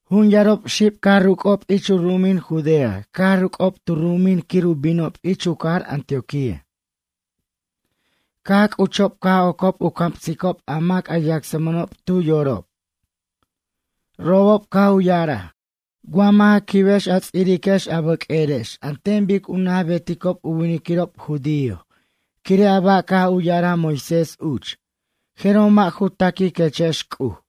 Jun yarob xib caj ruc'ob ich u ru'umin Judea caj ruc'ob tu ru'umin quir u binob ich u cajar Antioquía. Caj c'uchob caj ocob u camsicob a mac a yacsmʌnob tu yorob. Robob caj u ya'araj: ―Wa mʌ' ja quibex a ts'iriquex a bʌq'uerex an ten bic u naj beticob u winiquirob judío, quire' a ba' caj u ya'araj Moisés uch, jeroj mʌ' ju taquiquechex C'uj.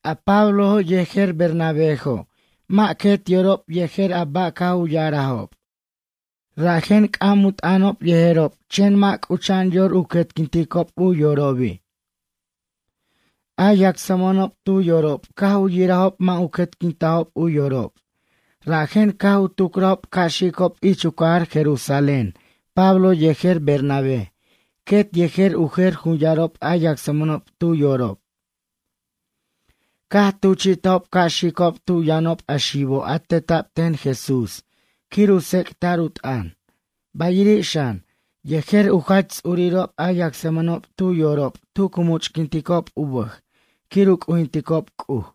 A Pablojo' yejer Bernabéjo' mʌ' quet yorob yejer a ba' caj u ya'arajob, rajen c'am u t'ʌnob yejerob, chen mʌ' c'ucha'an yor u quetquinticob u yorobi'. A yacsmʌnob tu yorob caj u yirajob mʌ' u quetquintajob u yorob, rajen caj u tucrajob ca' xicob ich u cajar Jerusalén Pablo yejer Bernabé quet yejer u jer jun yarob a yacsmʌnob tu yorob. Caj tuchi'tajob ca' xicob tu yʌnob a xibo' a teta'b ten Jesús quir u tsec'ta'r u t'ʌn, bayiri' xan, yejer u jach ts'urirob a yacsmʌnob tu yorob tu cu much'quinticob u bʌj quir u c'ujinticob C'uj.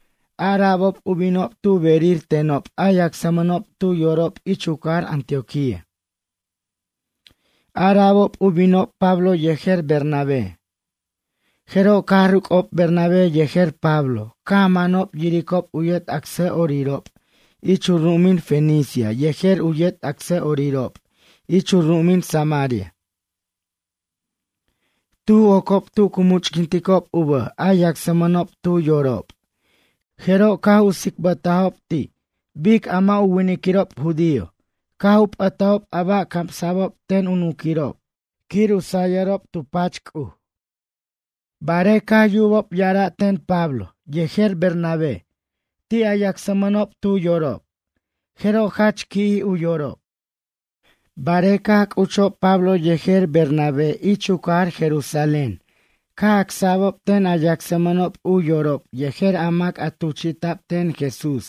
Ara'bob u binob tu berir tenob a yacsmʌnob tu yorob ich u cajar Antioquía. Ara'bob u binob Pablo yejer Bernabé. Jeroj caj ruc'ob Bernabé yejer Pablo, caj manob yiricob u yet acsa'orirob ich u ru'umin Fenicia yejer u yet acsʌ'orirob ich u ru'umin Samaria. Tuj ocob tu cu much'quinticob u bʌj a yacsmʌnob tu yorob, jeroj caj u tsicbʌtajob ti' bic a mʌ' u winiquirob judío caj u p'ʌtajob a ba' camsa'bob ten u nunquirob quir u sayʌrob tu pach C'uj. Barej caj yubob ya'ara' ten Pablo yejer Bernabé ti' a yacsmʌnob tu yorob jeroj jach qui'jij u yorob. Barej caj c'uchob Pablo yejer Bernabé ich u cajar Jerusalén, caj acsa'bob ten a yacsmʌnob u yorob yejer a mac a tuchi'ta'b ten Jesús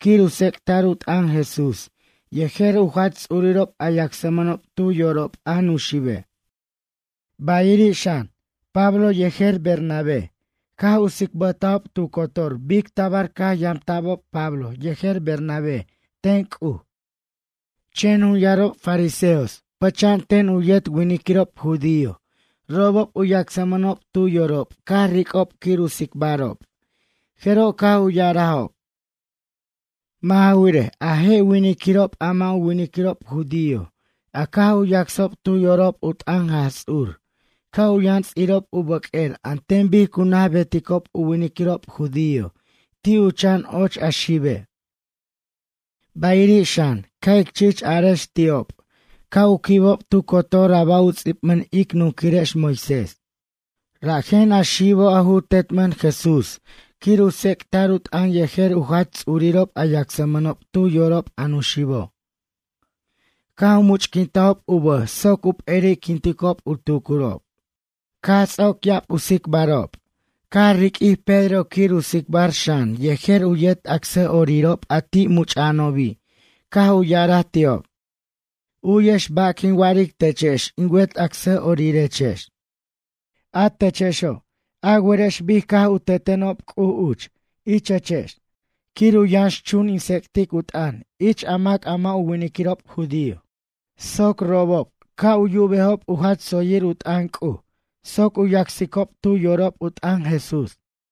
quir u tsec'ta'r u t'ʌn Jesús yejer u jach ts'uriob a yacsmʌnob tu yorob, a nuxibe'. Bayiri' xan, Pablo yejer Bernabé caj u tsicbʌtajob tu cotor bic tabar caj yamta'bob Pablo yejer Bernabé ten C'uj. Chen jun yarob fariseos pʌcha'an ten u yet winiquirob judío, robob u yacsmʌnob tu yorob caj ric'ob quir u tsicbarob, jeroj caj u ya'arajob: ―Mʌ' ja wirej, a je' winiquirob a mʌ' u winiquirob judío a caj u yacsob tu yorob u t'ʌn Jaj Ts'ur ca' u yʌn ts'irob u bʌq'uer an ten bic cu naj beticob u winiquirob judío ti' u chan och a xibe'. Bayiri' xan, ca' ic chich arex ti'ob ca' u quibob tu cotor a ba' u ts'ibmʌn ic nunquirex Moisés. Rajen a xibo', a ju tetmʌn Jesús quir u tsec'ta'r u t'ʌn yejer u jach ts'urirob a yacsmʌnob tu yorob a nuxibo', caj u much'quintob u bʌj soc u p'eri'quinticob u tucurob. Caj ts'oc ya'ab u tsicbarob, caj riq'uij Pedro quir u tsicbar xan yejer u yet acsʌ'orirob, a ti', much'a'anobi' caj u ya'araj ti'ob: ―U'yex ba' quin wa'aric techex in wet acsʌ'orirechex. A techexo', a werex bic caj u teteno' C'uj uch ichechex quir u yʌnxchun in tsec'tic u t'ʌn ich a mac a mʌ' u winiquirob judío soc robob ca' u yubejob u jach tsoyir u t'ʌn C'uj soc u yacsicob tu yorob u t'ʌn Jesús.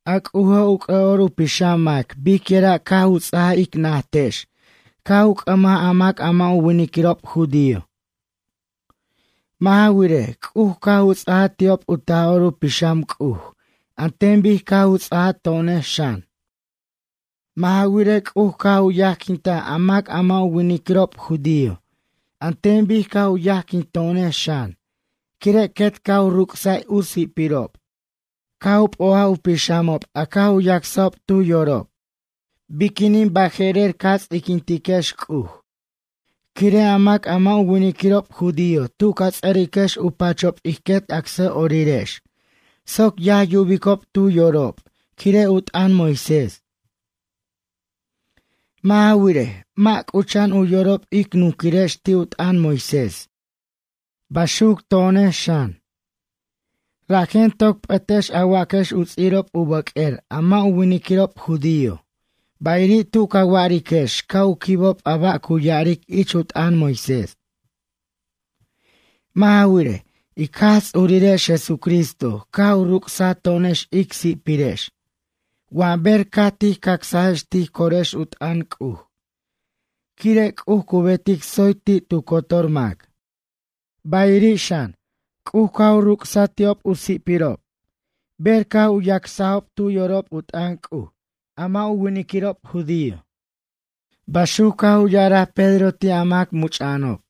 A C'ujo', u c'ʌ'or u pixam mac biquira' caj u ts'ajaj ic najtex caj u c'ʌmaj a mac a mʌ' u winiquirob judío. Mʌ' ja wirej, C'uj caj u ts'ajaj ti'ob u Taj'or u Pixam C'uj an ten bic caj u ts'ajaj to'onex xan. Mʌ' ja wirej, C'uj caj u yajquintaj a mac a mʌ' u winiquirob judío an ten bic caj u yajquinto'onex xan, quire' quet caj u ruc'saj u si'pirob, caj u p'o'aj u pixamob a caj u yacsajob tu yorob. Biquinin baje'rer ca ts'iquintiquex C'uj, quire' a mac a mʌ' u winiquirob judío tu ca ts'ʌriquex u pachob ij quet acsa'orirex soc yaj yubicob tu yorob, quire' u t'ʌn Moisés. Mʌ' ja wirej, mʌ' c'ucha'an u yorob ic nunquirex ti' u t'ʌn Moisés, baxuc to'onex xan. Rajen toc p'ʌtex a waquex u ts'irob u bʌq'uer a mʌ' u winiquirob judío bayiri' tu ca wa'ariquex ca' u quibob a ba' cu ya'aric ich u t'ʌn Moisés. Mʌ' ja wirej, ic Jaj Ts'urirex Jesucristo caj u ruc'saj to'onex ic si'pirex wa ber caj tij cacsajex tij corex u t'ʌn C'uj, quire' C'uj cu betic tsoy ti' tu cotor mac. Bayiri' xan, C'uj caj u ruc'saj ti'ob u si'pirob, ber caj u yacsajob tu yorob u t'ʌn C'uj, a mʌ' u winiquirob judío ―baxuc caj u ya'araj Pedro ti' a mac much'a'anob.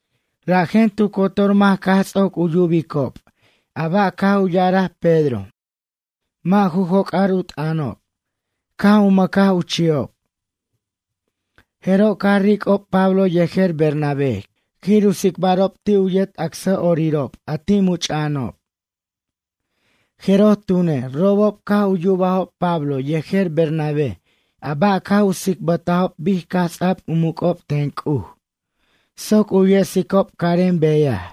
Rajen tu cotor mac caj ts'oc u yubicob a ba' caj u ya'araj Pedro mʌ' ju joc'ar u t'ʌnob, caj u mʌcaj u chi'ob. Jeroj caj ric'ob Pablo yejer Bernabé quir u tsicbarob ti' u yet acsa'orirob, a ti' much'a'anob. Jeroj tune', robob caj u yubajob Pablo yejer Bernabé a ba' caj u tsicbatajob bic caj ts'a'b u muc'ob ten C'uj soc u yesicob carem beyaj,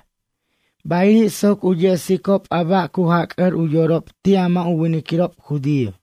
bayiri' soc u yesicob a ba' cu jac'ʌr u yorob ti' a mʌ' u winiquirob judío.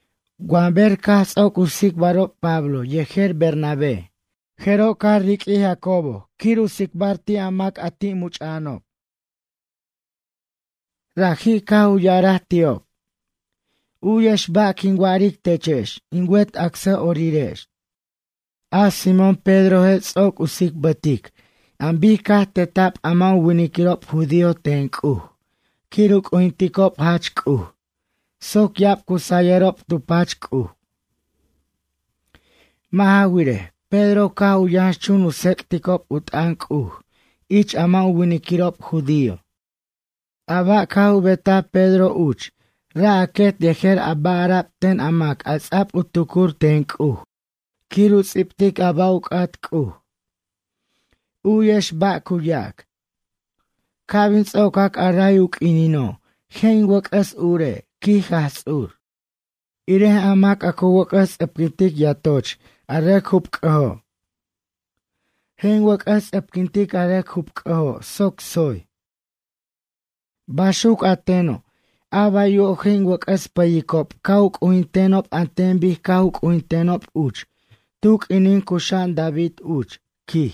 Wa ber caj ts'oc u tsicbarob Pablo yejer Bernabé, jeroj caj riq'uij Jacobo u tsicbar ti' a mac a ti' much'a'anob. Raji', caj u ya'araj ti'ob: ―U'yex ba' quin wa'aric techex in wet acsa'orirex. A Simón Pedroje' ts'oc u tsicbatic an bic caj teta'b a mʌ' u winiquirob judío ten C'uj quir u c'ujinticob jach C'uj, soc ya'ab cu sayʌrob tu pach C'uj. Mʌ' ja wirej, Pedro caj u yʌnxchun u tsec'ticob u t'ʌn C'uj ich a mʌ' u winiquirob judío. A ba' caj u betaj Pedro uch ra' a quet yejer a ba' ara'b ten a mac a ts'a'b u tucur ten C'uj quir u ts'ibtic a ba' u c'at C'uj. U'yex ba' cu yac: Ca' bin ts'ocac a ray u q'uinino', je' in wʌc'ʌs ure', quij Jaj Ts'ur. Irej a mac cu wʌc'ʌs ts'ʌpquintic yatoch a rʌc jupc'ʌjo'. Je' in wʌc'ʌs ts'ʌpquintic a rʌc jupc'ʌjo' soc tsoy. Baxuc a teno', a baywo' je' in wʌc'ʌs pʌyicob ca' u c'ujintenob an ten bic caj u c'ujintenob uch tu q'uinin cuxa'an David uch, quij.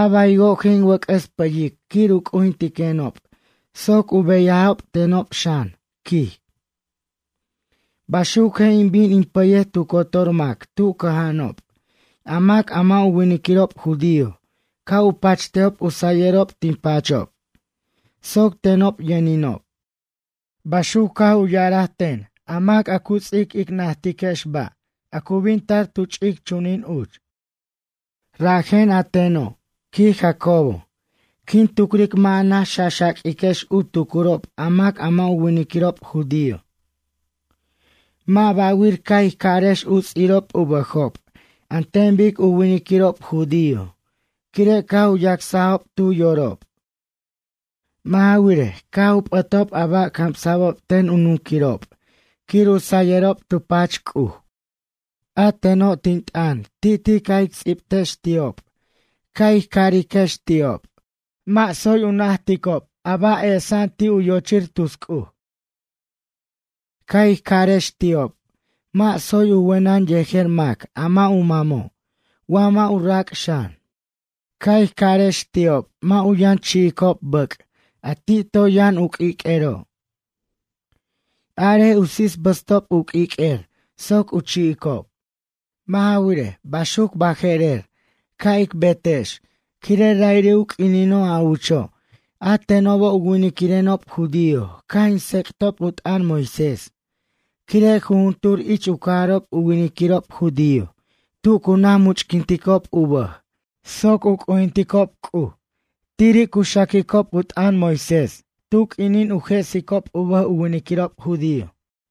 A baywo' je' in wʌc'ʌs pʌyic quir u c'ujintiquenob soc u beyajob tenob xan, quij. Baxuc je' in bin in pʌyej tu cotor mac tu cʌja'anob, a mac a mʌ' u winiquirob judío ca' u pachtejob u sʌyʌrob tin pachob, soc tenob yʌninob. Baxuc caj u ya'arej ten a mac a cu ts'ic ic najtiquex ba' a cu bin tar tu ch'ic chunin uch. ’Rajen a teno' ―quij Jacobo―, quin tucric mʌ' a naj xaxaq'uiquex u tucurob a mac a mʌ' u winiquirob judío. Mʌ' ba'wir ca' ij carex u ts'irob u bʌjob an ten bic u winiquirob judío quire' caj u yacsajob tu yorob. Mʌ' ja wirej, caj u p'ʌtob a ba' camsa'b ten u nunquirob quir u sayʌrob tu pach C'uj. A teno', tin t'ʌn ti'ti' ca' ic ts'ibtex ti'ob, ca' ij ca'ariquex ti'ob, mʌ' tsoy u janticob ba' esa'an ti' u yochir tus c'uj. Ca' ij ca'arex ti'ob, mʌ' tsoy u wenʌn yejer mac a mʌ' u mamo', wa mʌ' u rac' xan. Ca' ij ca'arex ti'ob, mʌ' u yʌn chi'icob bʌc', a ti' toy yʌn u q'uiq'uero'. Arej u sisbʌstob u q'uiq'uer soc u chi'icob. Mʌ' ja wirej, baxuc baje'rer, ca' ic betex, quire' ra'iri' u q'uinino' a ucho', a tenobo' u winiquirenob judío caj in tsec'tob u t'ʌn Moisés, quire' jujuntur ich u cajarob u winiquirob judío tu cu naj much'quinticob u bʌj soc u c'ujinticob C'uj tiri' cu xaquicob u t'ʌn Moisés tu q'uinin u jesicob u bʌj u winiquirob judío.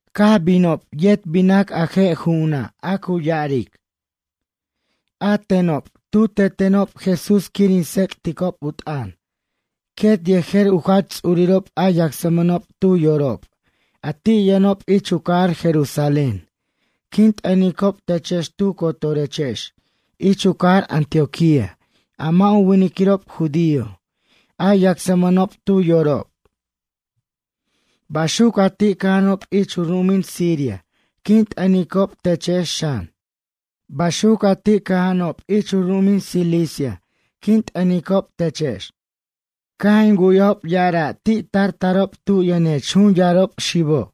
Caj binob yet binac a je' ju'una' a cu ya'aric: “A tenob, tu tetenob Jesús quir in tsec'ticob u t'ʌn, quet yejer u jach ts'urirob a yacsmʌnob tu yorob, a ti' yʌnob ich u cajar Jerusalén quin t'ʌnicob techex tu cotorechex ich u cajar Antioquía a mʌ' u winiquirob judío a yacsmʌnob tu yorob. Baxuc a ti' cʌja'anob ich u ru'umin Siria quin t'ʌnicob techex xan. Baxuc a ti' cʌja'anob ich u ru'umin Cilicia quin t'ʌnicob techex. Caj in wu'yajob ya'ara' ti' tar tarob tu yʌnechex jun yarob xibo'.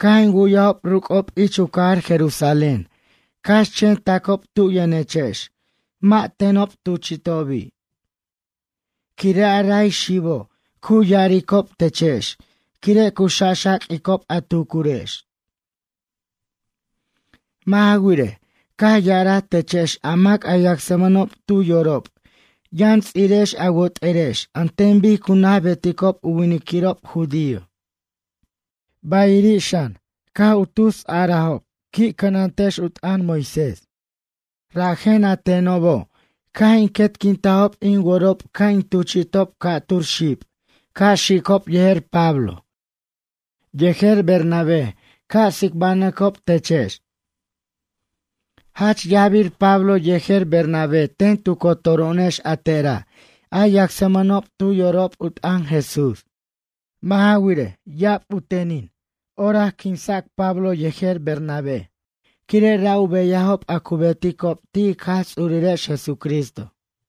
Caj in wu'yajob ruc'ob ich u cajar Jerusalén, cax chen tacob tu yʌnechex, mʌ' tenob tuchi'tobi'. Quire' a ray a xibo', cu ya'aricob techex, quire' cu xaxaq'uicob a tucurex. Mʌ' ja wirej, caj ya'araj techex a mac a yacsmʌnob tu yorob yʌn ts'irex a wot'erex an ten bic cu naj beticob u winiquirob judío. Bayiri' xan, caj u tus arajob qui' cʌnantex u t'ʌn Moisés. Rajen a tenobo', caj in quetquintajob in worob ca' in tuchi'tob ca'tur xib ca' xicob yejer Pablo, yejer Bernabé ca' tsicbanʌcob techex. Jach yajbir Pablo yejer Bernabé ten tu cotoro'onex a tera' a yacsmʌnob tu yorob u t'ʌn Jesús. Mʌ' ja wirej, ya'ab u tenin orac u quinsa'b Pablo yejer Bernabé, quire' ra' u beyajob a cu beticob ti' ic Jaj Ts'urirex Jesucristo.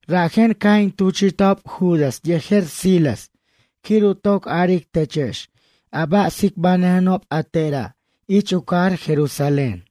Rajen caj in tuchi'tajob Judas yejer Silas quir u toc aric techex a ba' tsicbʌjenob a tera' ich u cajar Jerusalén.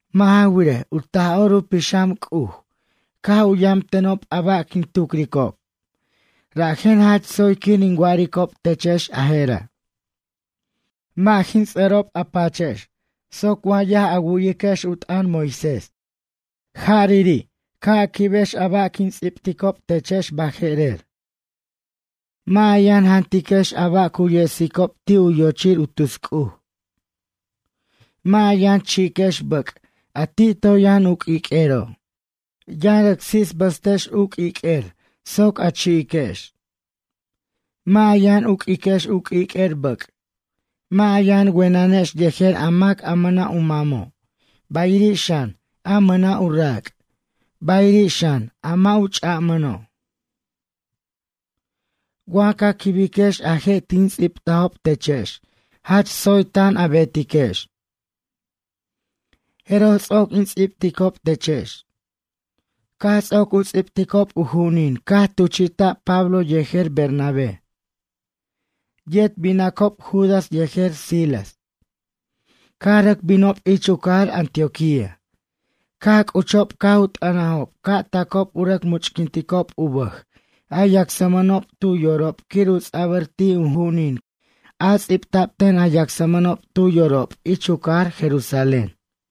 Mʌ' ja wirej, u Taj'or u Pixam C'uj caj u yam tenob a ba' quin tucricob, rajen jach tsoy quir in wa'aricob techex a jera'. Mʌ' in ts'ʌrob a pachex soc wa yaj a wu'yiquex u t'ʌn Moisés. Jarari' ca' a quibex a ba' quin ts'ibticob techex baje'rer: Mʌ' a yan jantiquex a ba' cu yesicob ti' u yochir u tus C'uj. Mʌ' a yʌn chi'iquex bʌc' a ti' toy yʌn u q'uiq'uero'. Yʌn rʌc sisbʌstex u q'uiq'uer soc a chi'iquex. Mʌ' a yan uq'iquex u q'uiq'uer bʌc'. Mʌ' a yʌn wenʌnex yejer a mac a mʌna' u mamo', bayiri' xan, a mʌna' u rac', bayiri' xan a mʌ' u ch'amʌno'. Wa ca quibiquex a je' tin ts'ibtajob techex jach tsoy tan a betiquex.” Jeroj ts'oc in ts'ibticob techex. Caj ts'oc u ts'ibticob u ju'unin caj tuchi'ta'b Pablo yejer Bernabé. Yet binacob Judas yejer Silas. Caj rʌc binob ich u cajar Antioquía. Caj c'uchob caj u t'ʌnajob ca' tacob u rʌc much'quinticob u bʌj a yacsmʌnob tu yorob quir u ts'abʌr ti' u ju'unin a ts'ibta'b ten a yacsmʌnob tu yorob ich u cajar Jerusalén.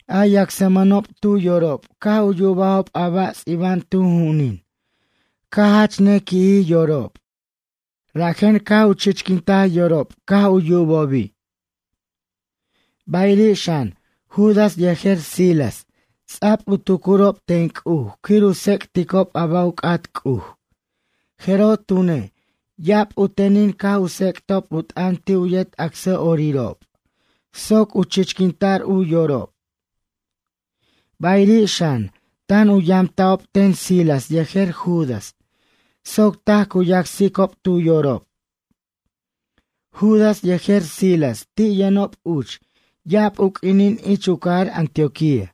A yacsmʌnob tu yorob caj u yubajob a ba' ts'iba'an tu ju'unin, caj jach ne qui'jij yorob, rajen caj u chichquintaj yorob caj u yubobi'. Bayiri' xan, Judas yejer Silas ts'a'b u tucurob ten C'uj quir u tsec'ticob a ba' u c'at C'uj, jeroj tune', ya'ab u tenin caj u tsec'tob u t'ʌn ti' u yet acsa'orirob soc u chichquinta'r u yorob. Bayiri' xan, tan u yamta'ob ten Silas yejer Judas soc taj cu yacsicob tu yorob. Judas yejer Silas ti' yʌnob uch ya'ab u q'uinin ich u cajar Antioquía.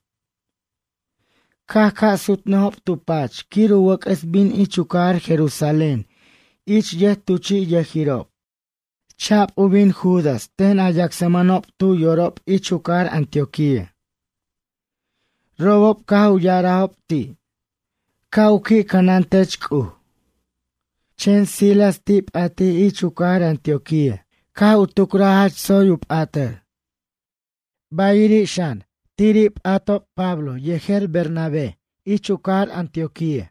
Caj ca' sutnʌjob tu pach quir u wʌc'ʌs bin ich u cajar Jerusalén ich yʌjtuchi'yʌjirob. Cha'b u bin Judas ten a yacsmʌnob tu yorob ich u cajar Antioquía. Robob caj u ya'arajob ti': ―Ca' u qui' cʌnantech C'uj. Chen Silas ti' p'atij ich u cajar Antioquía, caj u tucraj jach tsoy u p'atʌr. Bayiri' xan, tiri' p'atob Pablo yejer Bernabé ich u cajar Antioquía.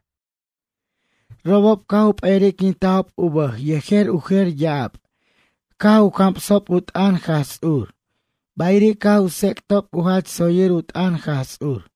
Robob caj u p'eriquintajob u bʌj yejer u jer ya'ab caj u camsob u t'ʌn Jaj Ts'ur, bayiri' caj u tsec'tob u jach tsoyir u t'ʌn Jaj Ts'ur.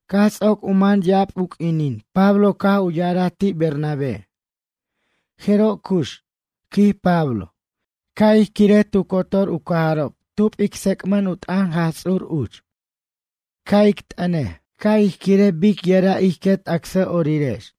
Caj ts'oc u man ya'ab u q'uinin Pablo caj u ya'araj ti' Bernabé: ―Jeroj cux ―quij Pablo―, ca' ij quirej tu cotor u cajarob tub ic tsec'mʌn u t'ʌn Jaj Ts'ur uch. Ca' ij t'ʌnej, ca' ij quirej bic yira' ij quet acsa'orirex.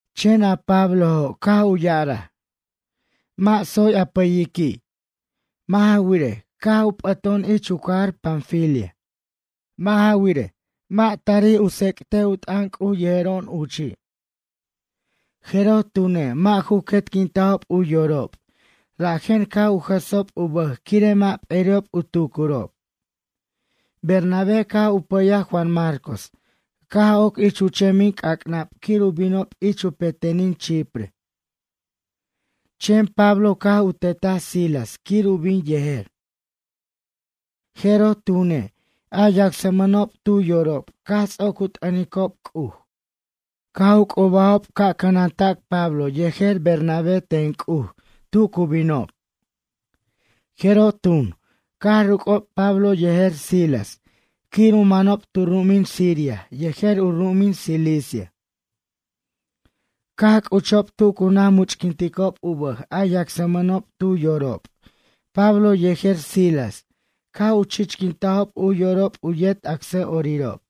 Chen a Pablojo', caj u ya'araj: ―Mʌ' tsoy a pʌyiqui'. Mʌ' ja wirej, caj u p'ato'on ich u cajar Panfilia. Mʌ' ja wirej, mʌ' tarij ic tsec'tej u t'ʌn C'uj yejero'on uchi'. Jeroj tune', mʌ' ju quetquintajob u yorob rajen caj u jʌsob u bʌj quire' mʌ' peri'ob u tucurob. Bernabé caj u pʌyaj Juan Marcos caj oc ich u chemin c'ac'nab quir u binob ich u petenin Chipre. Chen Pablo caj u tetaj Silas quir u bin yejer. Jeroj tune, a yacsmʌnob tu yorob, caj ts'oc u t'ʌnicob C'uj caj u c'ubajob ca' cʌnanta'c Pablo yejer Bernabé ten C'uj tu cu binob. Jeroj tun, caj ruc'ob Pablo yejer Silas quir u manob tu ru'umin Siria yejer u ru'umin Cilicia. Caj c'uchob tu cu naj much'quinticob u bʌj a yacsmʌnob tu yorob Pablo yejer Silas caj u chichquintajob u yorob u yet acsa'orirob.